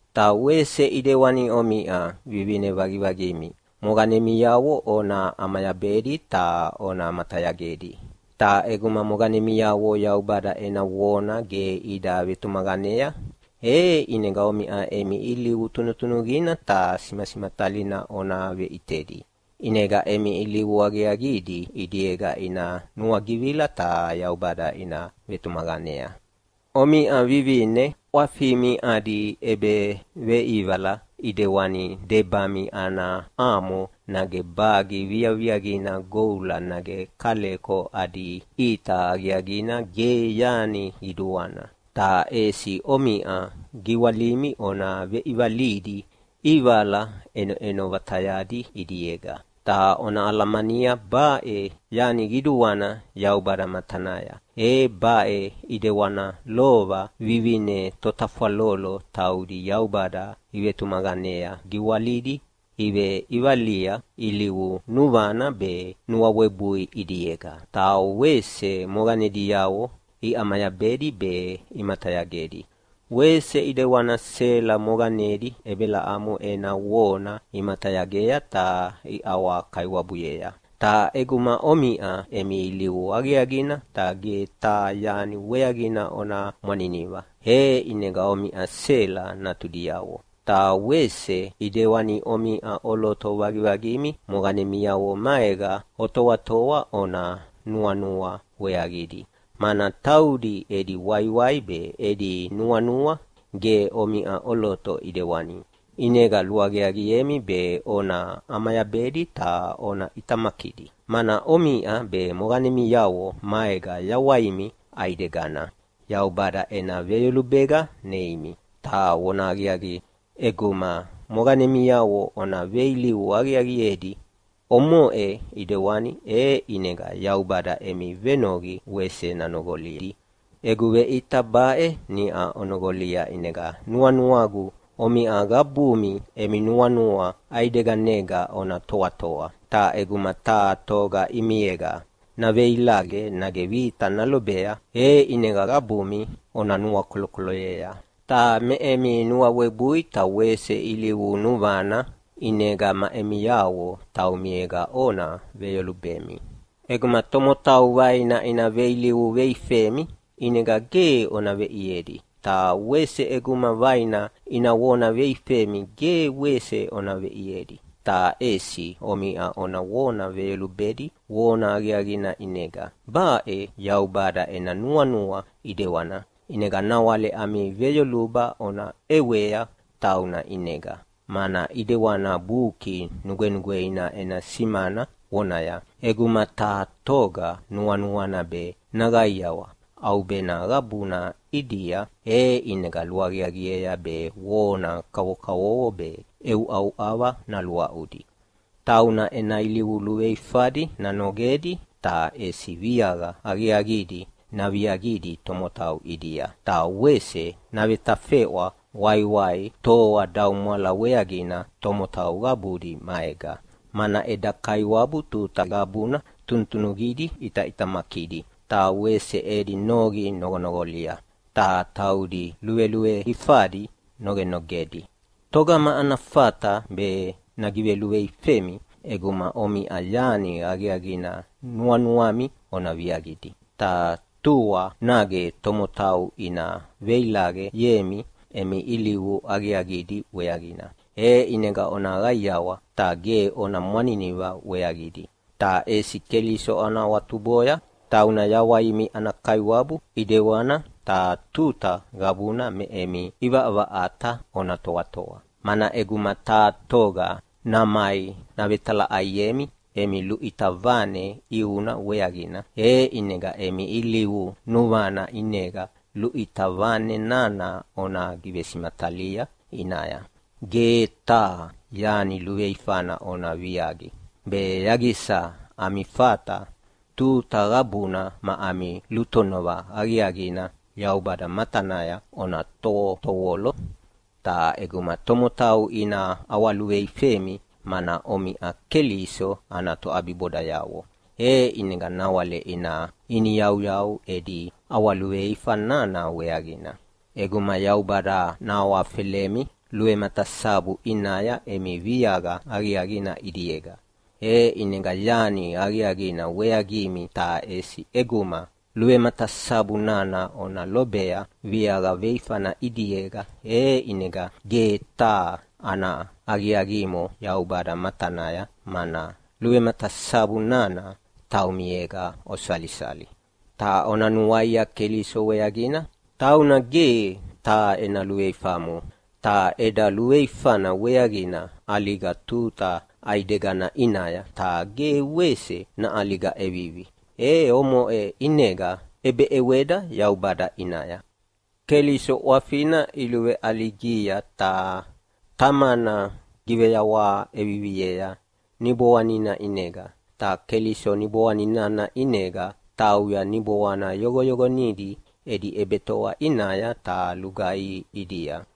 Ta wese ʼidewani omiʼa vivine vaqivaqimi moqanemiavo ona ʼamayabedi ta ona matayagedi. Ta ʼeguma moqanemiavo Yaubada ena vona ge ida vetumaqanea, ʼinega omiʼa emi ilivu tunutunuqina ta simasimatalina ona veʼitedi. ʼInega emi ilivu aqiaqidi ʼidiega ina nuagivila ta Yaubada ina vetumaqanea. Omiʼa vivine ʼwafimi adi ʼebeveʼivala ʼidewani debami ana amo nage bagi viaviaqina goula, nage kaleko adi ʼita aqiaqina ge yani qiduana, ta ʼesi omiʼa giwalimi ona veʼivalidi ʼivala ʼenoʼeno vatayadi ʼidiega, ta ona alamania baʼe yani qiduana Yaubada matanaya. E baʼe ʼidewana lova vivine totafwalolo taudi Yaubada ivetumaqanea giwalidi iveʼivalia ilivu nuvana be nuawebui ʼidiega, ta wese moqanediavo iʼamayabedi be imatayagedi. Wese ʼidewana Sela moqanedi Ebelamo ena vona imatayagea ta iʼawakaiwabuyea. Ta ʼeguma omiʼa emi ilivu aqiaqina ta ge taha yani weaqina ona mwaniniva, e ʼinega omiʼa Sela natudiavo. Ta wese ʼidewani, omiʼa ʼoloto vaqivaqimi moqanemiavo maega otoatoa ona nuanua weaqidi, mana taudi edi waiwai be edi nuanua ge omiʼa ʼoloto ʼidewani. ʼInega luaqiaqiemi be ona ʼamayabedi ta ona ʼitamakidi, mana omiʼa be moqanemiavo maega yawaimi ʼaidegana Yaubada ena veyolubega neimi. Ta vonahaqiaqi, ʼeguma moqanemiavo ona veilivu aqiaqiedi omoʼe ʼidewani, e ʼinega Yaubada emi venoqi wese nanoqolidi. Egu veʼita baʼe niʼa onoqolia, ʼinega nuanuagu omiʼa qabumi emi nuanua ʼaideganega ona toatoa, ta ʼeguma taha toga ʼimiega naveilaqe nage vita nalobea, e ʼinega qabumi ona nuakolokoloyea. Ta me emi nuawebui ta wese ilivu nuvana ʼinega ma emiavo taumiega ona veyolubemi. ʼEguma tomotau vaina ina veilivu veifemi ʼinega ge ona veʼiedi. Ta wese ʼeguma vaina ina vona veifemi ge wese ona veʼiedi, ta ʼesi omiʼa ona vona veyolubedi vona aqiaqina ʼinega. Baʼe Yaubada ena nuanua ʼidewana, ʼinega nawale ami veyoluba ona ʼewea tauna ʼinega, mana ʼidewana Buki Nugwenugweina ena simana vonaya, “ʼEguma taha toga nuanuana be naqaiawa ʼaubena qabuna ʼidia, e ʼinega luaqiaqiea be vona kavokavovo be ʼeuʼauʼava naluaʼudi. Tauna ena ilivu luveifadi nanogedi ta ʼesi viaqa aqiaqidi naviaqidi tomotau ʼidia. Ta wese navetafeʼwa waiwai toadaumwala weaqina tomotau qabudi maega. Mana eda Kaiwabu tuta qabuna tunutunuqidi ʼitaʼitamakidi, ta wese edi noqi noqonoqolia, ta taudi luveluveifadi nogenogedi.” Togama ana fata be nagiveluveifemi ʼeguma omiʼa yani aqiaqina nuanuami ona viaqidi? Ta tua nage tomotau ina veilaqeyemi emi ilivu aqiaqidi weaqina, e ʼinega ona qaiawa ta ge ona mwaniniva weaqidi. Ta ʼesi Keliso ona awatuboya, tauna yawaimi ana Kaiwabu ʼidewana. Ta tuta qabuna me emi ʼivaʼavaʼata ona toatoa, mana ʼeguma taha toga namai navetalaʼaiemi emi luʼita vane ʼiuna weaqina, e ʼinega emi ilivu nuvana ʼinega luʼita vane nana ona givesimatalia ʼinaya. Ge taha yani luveifana ona viaqi, be yaqisa ami fata tuta qabuna ma ami lutonova aqiaqina Yaubada matanaya ona tovotovolo. Ta ʼeguma tomotau ina ʼawaluveifemi mana omiʼa Keliso ana toʼabibodayavo, e ʼinega nawale ina iniyauyau edi ʼawaluveifa nana weaqina. ʼEguma Yaubada nahawafelemi luvematasabu ʼinaya emi viaqa aqiaqina ʼidiega, e ʼinega yani aqiaqina weaqimi, ta ʼesi ʼeguma luvematasabu nana ona lobea viaqa veifana ʼidiega e ʼinega ge taha ana aqiaqimo Yaubada matanaya, mana luvematasabu nana taumiega osalisali. Ta ona nuaia Keliso weaqina, tauna ge taha ena luveifamo, ta eda luveifana weaqina ʼaliga tuta ʼaidegana ʼinaya, ta ge wese naʼaliga ʼevivi. E omoʼe ʼinega ʼebeʼeweda Yaubada ʼinaya. Keliso ʼwafina iluveʼaligia ta Tamana giveyawaha ʼeviviea Niboanina ʼinega. Ta Keliso Niboanina ʼinega tauya niboana yoqoyoqonidi edi ʼebetoa ʼinaya ta lugaihi ʼidia,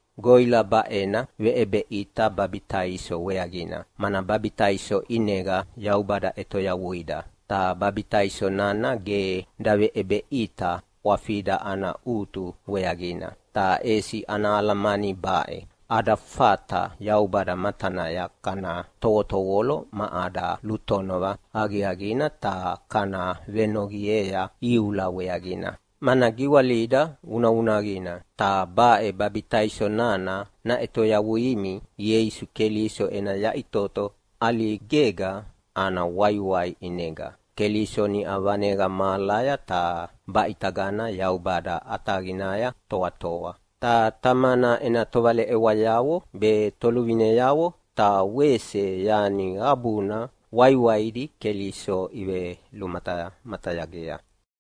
Goʼila baʼena veʼebeʼita babitaiso weaqina, mana babitaiso ʼinega Yaubada ʼetoyavuida. Ta babitaiso nana ge daveʼebeʼita ʼwafida ana ʼutu weaqina, ta ʼesi ana alamani baʼe: Ada fata Yaubada matanaya kana tovotovolo ma ada lutonova aqiaqina ta kana venoqiea iula weaqina, mana giwalida vunavunaqina. Ta baʼe babitaiso nana naʼetoyavuimi Ieisu Keliso ena yaʼitoto ʼaligega ana waiwai ʼinega. Keliso niʼa vaneqa mahalaya ta baʼitagana Yaubada ʼataqinaya toatoa, ta Tamana ena tovaleʼewayavo be toluvineavo ta wese yani qabuna waiwaidi Keliso ivelumatamatayagea.